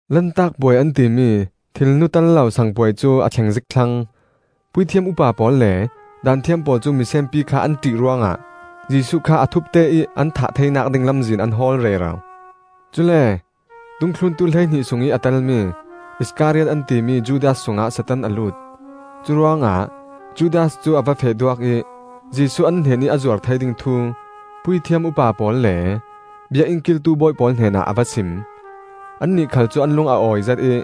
Lantak Puai an timi, thilnu tel lo sang puai cu a thleng zik thlang. Puithiam upa pawl le Daanthiam pawl cu misenpi kha an ṭih ruangah Jesuh kha a thupte ih an thah theinak ding lamzin an hawl rero. Cule dungthluntu hleihnih sungih a telmi Iskariot an timi Judas sungah Satan a lut. Curuangah Judas cu a va feh duak ih Jesuh an hnenih a zuar thei ding thu puithiam upa pawl le Biakinn kiltu bawi pawl hnenah a va sim. Annih khal cu an lung a awizet ih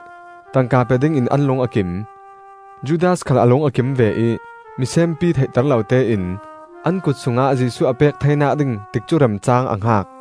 tangka pe dingin an lung a kim. Judas khal a lung a kim ve ih misenpi theihter lo tein an kut sungah Jesuh a pek theinak ding tikcu remcaang a hngak.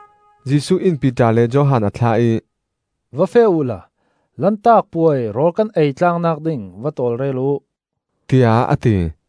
Jesuh in Piter le Johan a thlah ih, “Va feh uhla Lantak Puai rawl kan ei tlaangnak ding va tawlrel uh,” tiah a ti.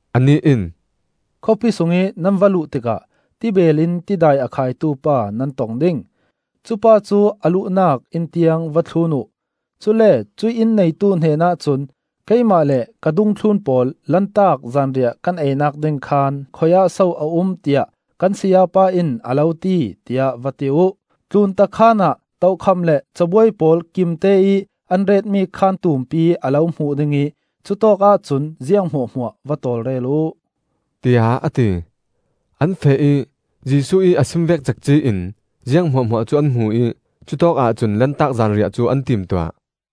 Anih in, “Khawpi sungih nan va luh tikah tibeel in tidai a khaitu pa nan tong ding. Cupa cu a luhnak inn tiang va thlun uh; cule cuih inn neitu hnenah cun ‘Keimah le ka dungthlun pawl Lantak zanriah kan einak ding khaan khui-ah so a um tiah kan Sayapa in a lo ti,’ tiah va ti uh. Tlunta khaan ah tokham le cabuai pawl kimteih an retmi khaan tumpi a lo hmuh ding ih cutawkah cun ziang hmuahhmuah va tawlrel uh,” tiah a ti. An feh ih Jesuh ih a sim vek cekci in ziang hmuahhmuah cu an hmu ih cutawkah cun Lantak zanriah cu an timtuah.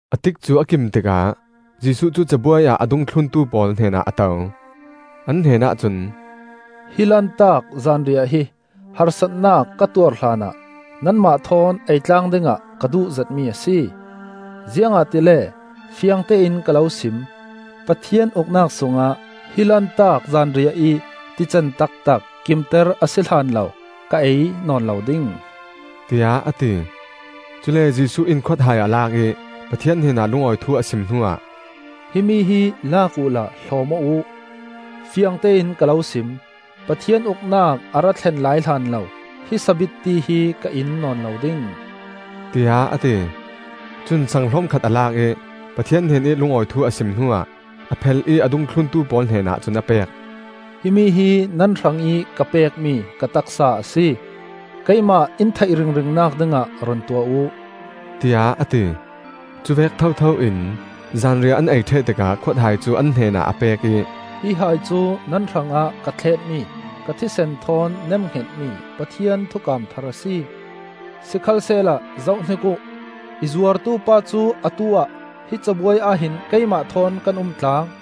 A tikcu a kim tikah Jesuh cu cabuai ah a dungthluntu pawl hnenah a to. An hnenah cun, “Hi Lantak zanriah hi harsatnak ka tuar hlanah nanmah thawn eitlang dingah ka duhzetmi a si. Ziangahtile fiangtein ka lo sim: Pathian Uknak sungah hi Lantak zanriah ih tican taktak kimter a si hlanlo ka ei nawn lo ding,” tiah a ti. Cule Jesuh in khuathai a lak ih Pathian hnenah lungawi thu a sim hnuah, “Himi hi lak uhla hlawm aw uh. Fiangtein ka lo sim: Pathian Uknak a ra thlen lai hlanlo hi sabitti hi ka in nawn lo ding,” tiah a ti. Cun saang hlom khat a lak ih Pathian hnenih lungawi thu a sim hnuah a phel ih a dungthluntu pawl hnenah cun a pek. “Himi hi nan hrangih ka pekmi ka taksa a si. Keimah in theih ringringnak dingah run tuah uh,” tiah a ti. Cuvek thotho in zanriah an ei ṭheh tikah khuathai cu an hnen ah a pek ih, “Hi hai cu nan hrangah ka thletmi ka thisen thawn nemhngetmi Pathian thukam thar a si. “Sikhalsehla zohhnik uh! I zuartupa cu atu-ah hi cabuai ahhin keimah thawn kan umtlang.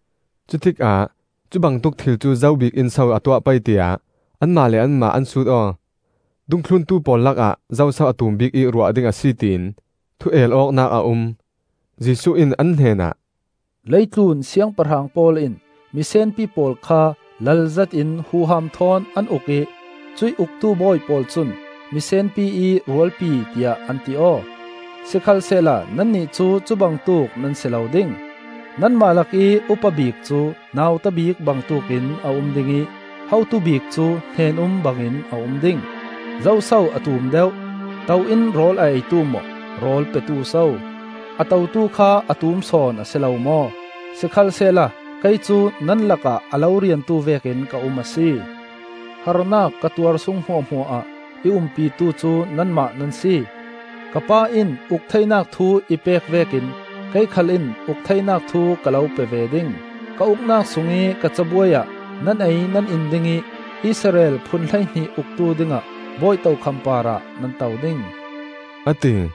Cutikah cubangtuk thil cu zo bikin so a tuah pei, tiah anmah le anmah an sut aw. Dungthluntu pawl lakah zoso a tum bik ih ruah ding a si, tiin thu-el awknak a um. Jesuh in an hnenah, “Leitlun siangpahrang pawl in misenpi pawl kha lal zetin huham thawn an uk ih cuih uktu bawi pawl cun ‘Miseenpi ih Rualpi,’ tiah an ti aw. Sikhalsehla nannih cu cubangtuk nan si lo ding; nanmah lakih upa bik cu nauta bik bangtuk in a um ding ih hotu bik cu hnen-um bangin a um ding. Zoso a tum deuh: To in rawl a eitu maw, rawl petu so? A totu kha a tum sawn a si lo maw? Sikhalsehla kei cu nan lakah a lo riantu vekin ka um a si. “Harnak ka tuar sung hmuahhmuah ah i umpitu cu nanmah nan si. Ka Pa in uk theinak thu i pek vekin kei khal in uk theinak thu ka lo pe ve ding. Ka Uknak sungih ka cabuai ah nan ei nan in ding ih Israel phun hleihnih uktu dingah bawi tokham parah nan to ding,” a ti.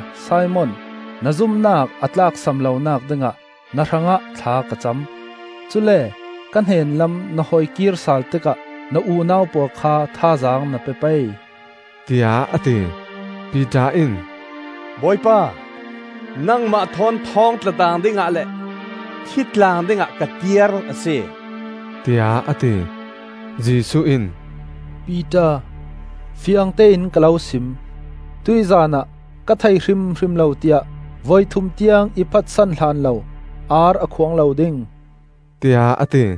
Sikhalsehla Simon, na zumnak a tlaksam lonak dingah na hrangah thla ka cam. Cule ka hnen lam na hoikir sal tikah na unau pawl kha thazaang na pe pei,” tiah a ti. Piter in, “Bawipa, nangmah thawn thawng tlatlaang dingah le thitlaang dingah ka tiar a si,” tiah a ti. Jesuh in, “Piter, fiangtein ka lo sim: Tuihzan ah ka thei hrimhrim lo tiah voithum tiang i phatsan hlanlo ar a khuang lo ding,” tiah a ti.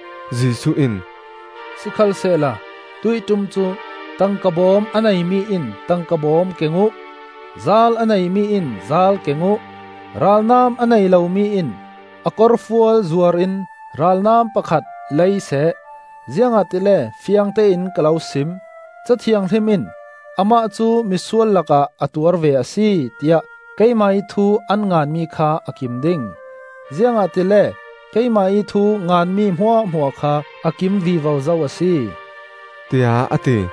Jesuh in, “Sikhalsehla tuih ṭum cu tangka bawm a nei mi in tangka bawm keng uh, zaal a nei mi in zaal keng uh. Ralnam a nei lo mi in a korfual zuar in ralnam pakhat leiseh. Ziangahtile fiangtein ka lo sim: Ca Thianghlim in ‘Amah cu misual lakah a tuar ve a si,’ tiah keimah ih thu an nganmi kha a kim ding; ziangahtile keimah ih thu nganmi hmuahhmuah kha a kim vivo zo a si,” tiah a ti.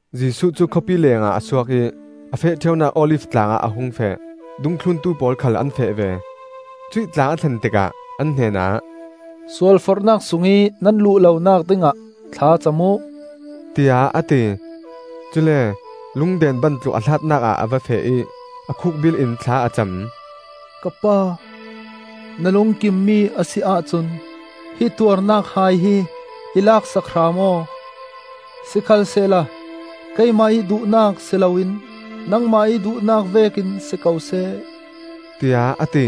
Jesuh cu khawpi lengah a suak ih a feh ṭheunak Olif tlang ah a hung feh; dungthluntu pawl khal an feh ve. Cuih tlang a thlen tikah an hnenah, “Sualforhnak sungih nan luh lonak dingah thla cam uh,” tiah a ti. Cule lungden ban tluk a hlatnak ah a va feh ih a khuk bilh in thla a cam. “Ka Pa, na lungkimmi a si ahcun hi tuarnak hai hi i lak sak hram aw. Sikhalsehla keimah ih duhnak si loin nangmah ih duhnak vekin si ko seh,” tiah a ti.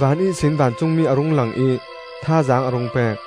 Van ihsin vancungmi a rung lang ih thazaang a rung pek.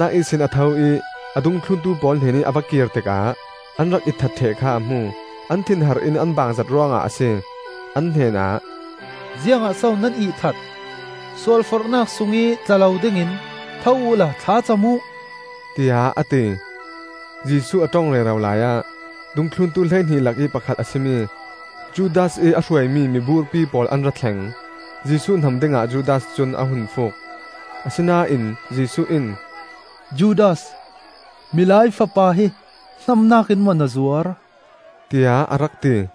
A thlacamnak ihsin a tho ih a dungthluntu pawl hnenih a va kir tikah an rak itthat ṭheh kha a hmu; an thinhar in an baangzet ruangah a si. An hnenah, “Ziangah so nan ihthat? Sualforhnak sungih tla lo dingin tho uhla thla cam uh,” tiah a ti. Jesuh a ṭong rero laiah dungthluntu hleihnih lakih pakhat a si mi Judas ih a hruaimi miburpi pawl an ra thleng. Jesuh hnam dingah Judas cun a hun fuuk. Asinain Jesuh in, “Judas, Milai Fapa hi hnamnak in maw na zuar?” tiah a rak ti.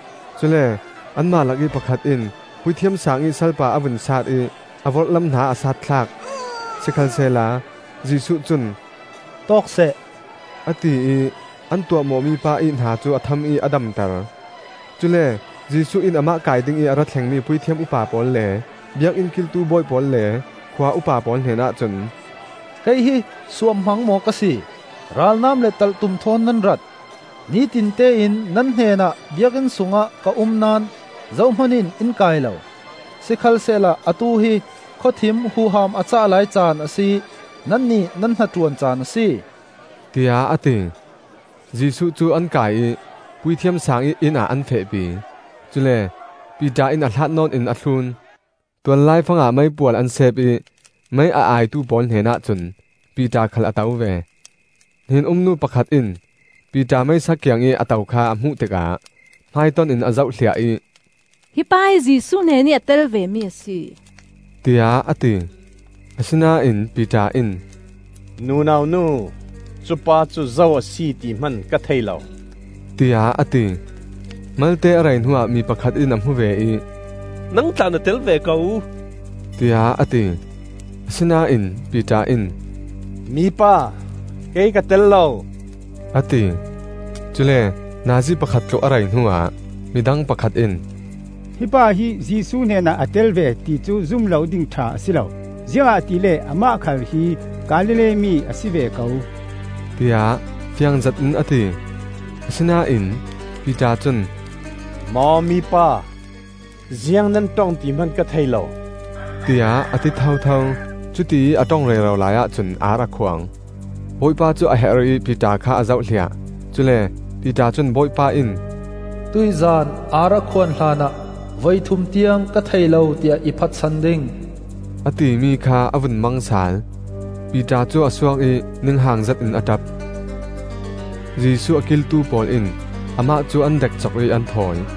Cule anmah lakih pakhat in Puithiam Saang ih salpa a vun saat ih a vorhlam hna a saat thlak. Sikhalsehla Jesuh cun, “Tawk seh!” a ti ih an tuahmawh mipa ih hna cu a tham ih a damter. Cule Jesuh in amah kai dingih a ra thlengmi puithiam upa pawl le biakinn kiltu bawi pawl le khua upa pawl hnenah cun, “Kei hi suamhmang maw ka si, ralnam le talhtum thawn nan rat? Nitinte in nan hnenah Biakinn sungah ka um naón zohman in in kai lo! Sikhalsehla atu hi khawthim huham a cah lai caan a si ih nannih nan hnaṭuan caan a si,” tiah a ti. Jesuh cu an kai ih Puithiam Sang ih innah an fehpi; cule Piter in a hlat nawn in a thlun. Tual laifangah meipual an sep ih mei a aitu pawl hnenah cun Piter khal a to ve. Hnen-um nu pakhat in Piter meisa kiangih a to kha a hmuh tikah hmaiton-in a zohhliah ih, “Hi pa hi Jesuh hnenih a tel vemi a si,” tiah a ti. Asinain Piter in, “Nunau nu, cupa cu zo a si ti hman ka thei lo,” tiah a ti. Malte a rei hnuah mi pakhat in a hmu ve ih, “Nang tla na tel ve ko,” tiah a ti. Asinain Piter in, “Mi pa, kei ka tel lo,” a ti. Cule nazi pakhat tluk a rei hnuah midang pakhat in, “Hi pa hi Jesuh hnenah a tel ve, ti cu zum lo ding ṭha a si lo; ziangahtile amah khal hi Galilee mi a si ve ko,” tiah fiang zetin a ti. Asinain Piter cun, “Maw mipa, ziang nan ṭong ti hman ka thei lo,” tiah a ti thotho. Cutiih a ṭong rero laiah cun ar a khuang. Bawipa cu a her ih Piter kha a zohhliah; cule Piter cun Bawipa in, “Tuihzan ar a khuan hlanah voithum tiang ka thei lo tiah i phatsan ding,” a timi kha a vun mang sal. Piter cu a suak ih ninghang zetin a ṭap. Jesuh a kiltu pawl in amah cu an dekcok ih an thawi.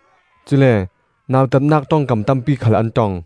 Cule nautatnak ṭongkam tampi khal an ṭong.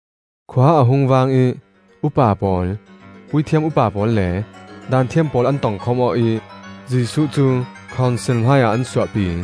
Khua a hung vang ih upa pawl, puithiam upa pawl le Daanthiam pawl an tongkhawm aw ih Jesuh cu khonsil hmaiah an suahpi.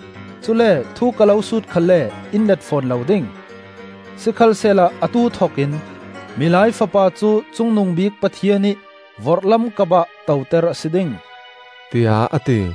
Cule thu ka lo sut khalle in let fawn lo ding. Sikhalsehla atu thokin Milai Fapa cu Cungnungbik Pathian ih vorhlam kapah toter a si ding,” tiah a ti.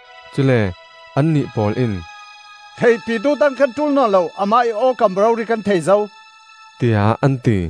Cule annih pawl in, “Theihpitu dang kan ṭul nawn lo. Amah ih awkam rori kan thei zo,” tiah an ti.